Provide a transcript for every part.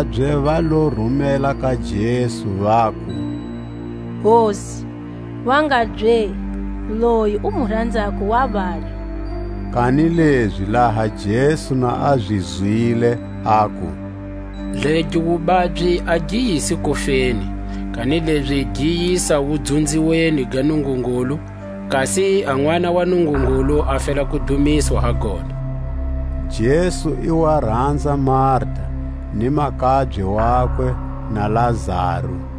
A vamakabye va lo rumela ka Jesu, vaku: Hosi, wangabye, loyi u mu ranzako wa babya. Kanilezi laha Jesu na a zi zwile, aku: Legi wubabyi a gi yisi kufeni, kanilezi gi yisa wudzunziweni ga Nungungulu; kasi a Nʼwana wa Nungungulu a fela ku dumiswa ha gona. Jesu i wa ranza Marta, ni makabye wakwe, na Lazaru.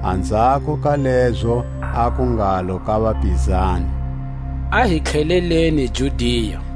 Anzhako ka lezo, a ku ngalo ka vapizani: A hi tlheleleni Judia.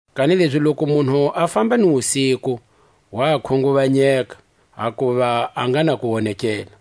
Kanilezi loku munhu a famba ni wusiku, wa khunguvanyeka, hakuva a nga na kuwonekela.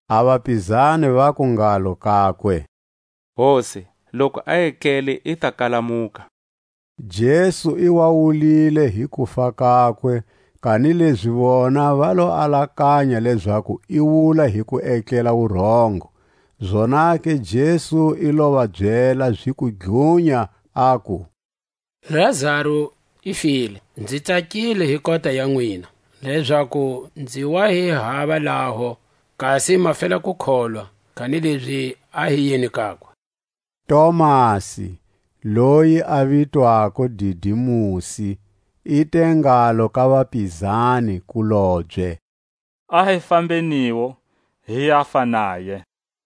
A vapizani vaku ngalo kakwe: Hosi, loku a etlele, i ta kalamuka. Jesu i wa wulile hi kufa kakwe, kanilezi vona va lo alakanya lezaku i wula hi ku etlela wurongo. Zonake Jesu i lo va byela ziku dlunya, aku: Lazaru i file. Nzi tsakile hi kota ya nwina, lezaku nzi wa hi hava laho, kasi ma fela ku kholwa; kanilezi a hi yeni kakwe. Tomasi, loyi a vitwako Didimusi, i te ngalo ka vapizani-kulobye: A hi fambeniwo, hi yafa naye.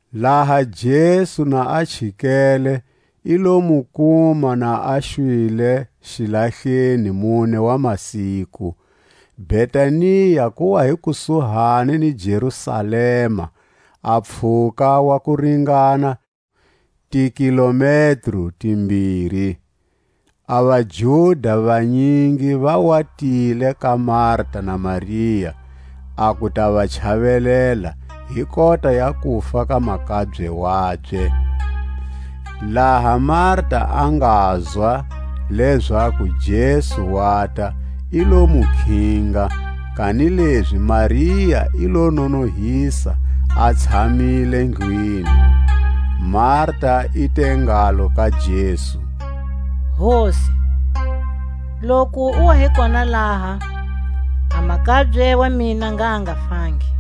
Laha Jesu na a chikele, i lo mu kuma na a xwile xilahleni mune wa masiku. Betania ku wa hi kusuhani ni Jerusalema, a pfhuka wa ku ringana tikilometro timbiri. A vaJuda vanyingi va wa tile ka Marta na Maria a ku ta va chavelela hi kota ya kufa ka makabye wabye. Laha Marta a ngazwa lezaku Jesu wata, i lo mu khinga; kanilezi Maria i lo nonohisa a tshamile ndlwini. Marta i te ngalo ka Jesu: Hosi, loku u wa hi kona laha, a makabye wa mina ngha a nga fangi.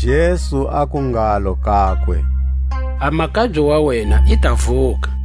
Jesu aku ngalo kakwe: A makabye wa wena i ta vuka.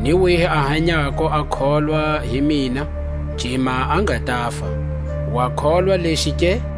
ni wihi a hanyako a kholwa hi mina, cima a nga tafa. Wa kholwa lexi ke?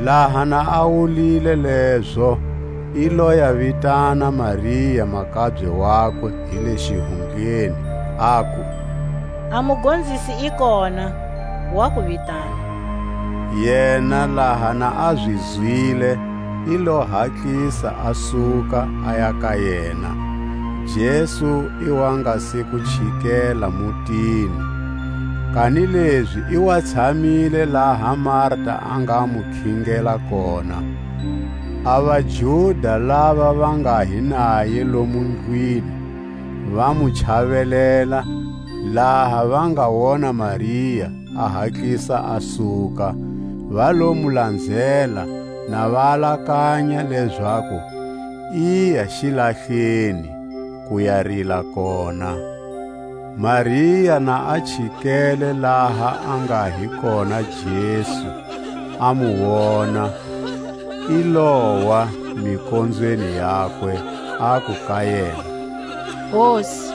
Laha na a wulile lezo, i lo ya vitana Maria makabye wakwe hi le xihundleni, aku: A Mugonzisi i kona, wa ku vitana. Yena laha na a zi zwile, i lo hatlisa a suka, aya ka yena. Jesu i wa nga se ku chikela mutini, kanilezi i wa tshamile laha Marta a nga mu khingela kona. A vaJuda lava va nga hi naye lomo ndlwini, va mu chavelela, laha va nga wona Maria a hatlisa a suka, va lo mu lanzela, na va alakanya lezaku iya xilahleni ku ya rila kona. Maria na a chikele laha a nga hi kona Jesu, a mu wona, i lowa mikonzweni yakwe, aku ka yena: Hosi,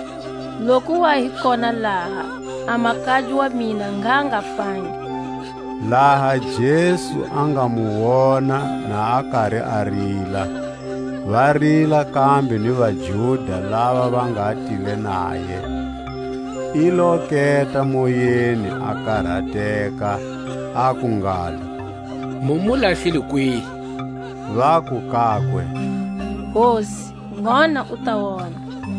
loku u wa hi kona laha, a makabye wa mina ngha a nga fangi. Laha Jesu a nga mu wona na kari a rila, va rila kambe ni vaJuda lava va nga tile naye, i lo keta moyeni, a karateka, aku ngalo: Mu mu lahlile kwihi? Vaku kakwe: Hosi, ngona u ta wona.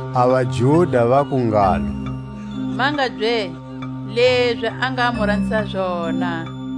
A vaJuda vaku ngalo: Mangabye, lezi a nga mu ranzisa zona!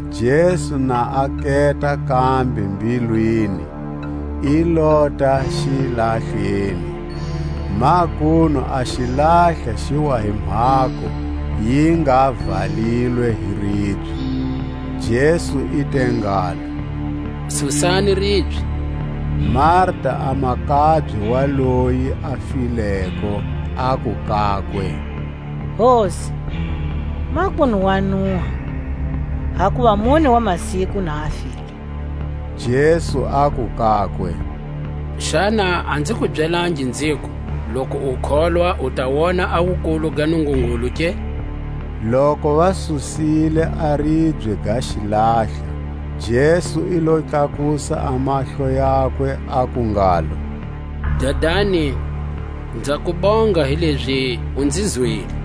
Jesu na a keta kambe mbilwini, i lota xilahleni. Makunu a xilahla xi wa hi mhako, yi nga valilwe hi ribye. Jesu i te ngalo: Susani ribye. Marta, a makabye wa loyi a fileko, aku kakwe: Hosi, makunu wa nuha, hakuva mune wa masiku na a file. Jesu aku kakwe: Xana a nzi ku byelangi nziku, loku u kholwa u ta wona a wukulu ga Nungungulu ke? Loku va susile a ribye ga xilahla, Jesu i lo tlakusa a mahlo yakwe, aku ngalo: Dadani, nza ku bonga hilezi u nzi zwile.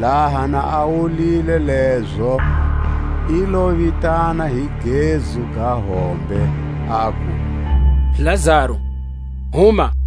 Laha na a wulile lezo, i lo vitana hi gezu ga hombe, aku: Lazaru, huma!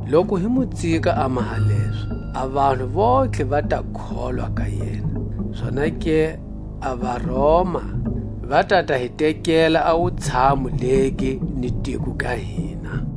Loku hi mu tsika a maha lezo, a vanhu vontlhe va ta kholwa ka yena; zonake a vaRoma va ta ta hi tekela a wutshamu legi ni tiko ga hina.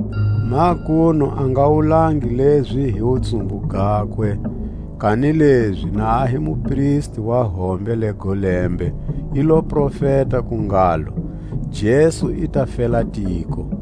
Makunu a nga wulangi lezi hi wutsumbu gakwe; kanilezi na a hi mupristi wa hombe lego lembe, i lo profeta ku ngalo: Jesu i ta fela tiko.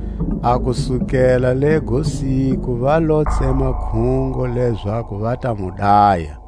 A kusukela lego siku va lo tsema khungo lezaku va ta mu daya.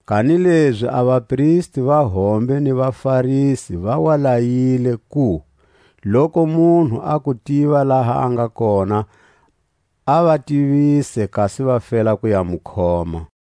Kanilezi a vapristi va hombe ni vaFarisi va wa layile ku, loku munhu a ku tiva laha a nga kona, a va tivise, kasi va fela ku ya mu khoma.